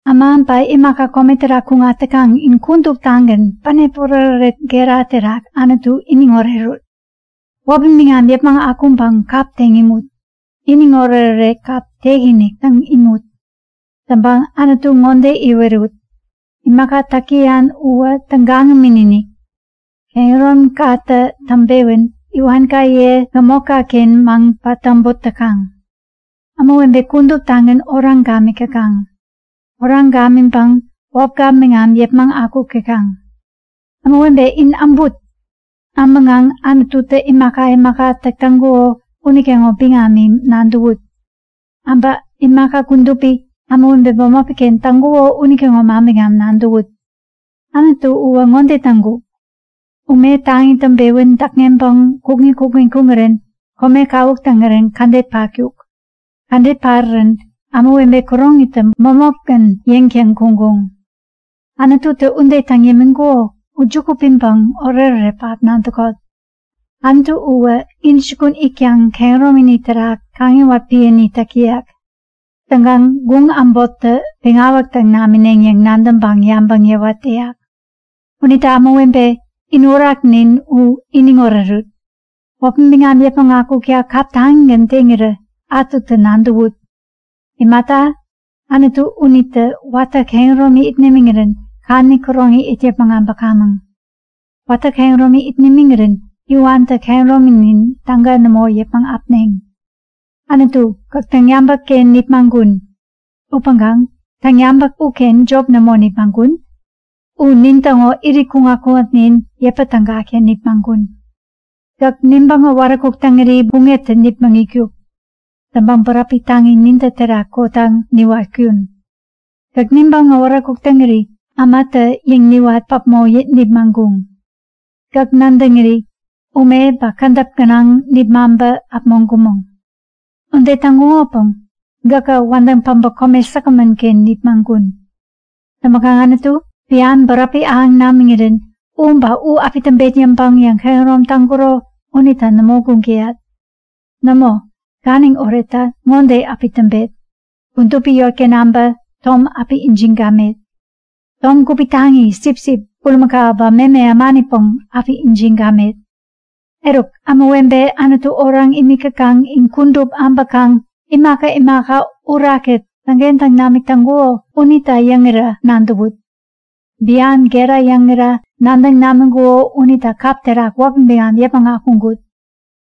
Äma ba imaka kome terak kuŋat täkaŋ, in kuduptagän bänep oretoret gera terak Anutu iniŋ orerut! Wäpi biŋam yäpmäŋ akuŋpäŋ kap teŋ imut! Iniŋ oretoret kap tek-inik täŋ imut. Täŋpäŋ Anutu ŋode iwerut; Imaka täk täyan uwä tägagämän-inik! Kehäromikatä täŋpewän iwankaye gämotkaken maŋ-patäbot täkaŋ. Ämawebe kuduptagän oraŋ gamik täkaŋ. Oraŋ gamiŋpäŋ wäpka biŋam yäpmäŋ akuk täkaŋ. Ämawebe, in äbut! Äbäŋkaŋ Anututä imaka imaka täk täŋkuko unitäŋo biŋami nadäwut. Äbä imaka kudupi, ämawebe bämopiken täŋkuko unitäŋo manbiŋam nadäwut. Anutu uwä ŋode täŋkuk; Ume taŋi täŋpewän däkŋeŋpeŋ kukŋi kukŋi kuŋirän kome kawuk taŋirän kädet patkuk. Kädet parirän ämawebe kuroŋitä bämopgän yeŋtäŋ kuŋkuŋ. Anututä ude täŋ yämiŋkuko u juku piŋpäŋ oretoret pähap nadäkot! Anutu uwä intäjukun itkaŋ kehäromini terak kaŋiwat piäni täk täyak. Täŋkaŋ guŋ äbottä peŋawäk täŋ namineŋ yäŋ nadäŋpäŋ yabäŋ yäwat täyak. Unita ämawebe, in Uraknin u iniŋ orerut! Wäpi biŋam yäpmäŋ akukta kap taŋigän teŋirä ätutä nadäwut! Imata, Anutu unitä watä kehäromi it nimiŋirän kadäni käroŋi it yäpmäŋ äbäkamäŋ. Watä kehäromi it nimiŋirän iwantä kehärominin täga nämo yäpmäŋ äpneŋ. Anutu, gäk täŋyabäkken nipmaŋkun. Upäŋkaŋ täŋyabäk uken jop nämo nipmaŋkun. U nintäŋo irit kuŋat-kuŋatnin yäpä tägakta nipmaŋkun. Gäk nibäŋ äwaräkuk täŋiri buŋeptä nipmäŋitkuk. Täŋpäŋ bäräpi taŋi nintä terak kotaŋ niwatkun. Gäk nibäŋ äwaräkuk täŋiri ämatä yeŋ niwat päpmo nipmaŋkuŋ. Gäk nadäŋiri ume ba kädäp gänaŋ nipmaŋpä äpmoŋkumäŋ. Ude täŋkuŋopäŋ gäkä wädäŋ päbä kome säkgämän-ken nipmaŋkun. Täŋpäkaŋ Anutu, bian bäräpi ahäŋ namiŋirän u ba u api täŋpet yäŋpäŋ yäŋkehärom taŋkuro unita nämo guŋ täyat. Nämo, ganiŋ oretta ŋode api täŋpet; Kudupi yotken äbä tom api ijiŋ gamet. Tom gupi taŋi, sipsip, bulimakau ba meme ämanipäŋ api ijiŋ gamet. Eruk, ämawebe Anutu oraŋ imik täkaŋ, in kudup äbäkaŋ imaka imaka Uraktä täŋkentäŋ namik täŋkuko unita yäŋira nadäwut. Bian gera yäŋira nadäŋ namiŋkuko unita kap terak wäpi biŋam yäpmäŋ akuŋkut.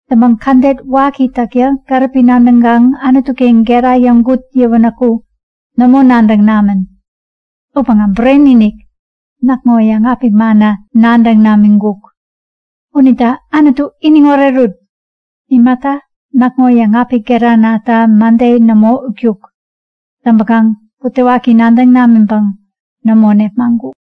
Täŋpäŋ kädet waki täkta gäripi nadäŋkaŋ Anutuken gera yäŋkut yäwänäku nämo nadäŋ namän. Upäŋkaŋ, bureni-inik! Näkŋo yäŋapik manna nadäŋ namiŋkuk. Unita Anutu iniŋ orerut! Imata, näkŋo yäŋapik geranata mäde nämo utkuk. Täŋpäkaŋ butewaki nadäŋ namiŋpäŋ nämo nepmaŋkuk.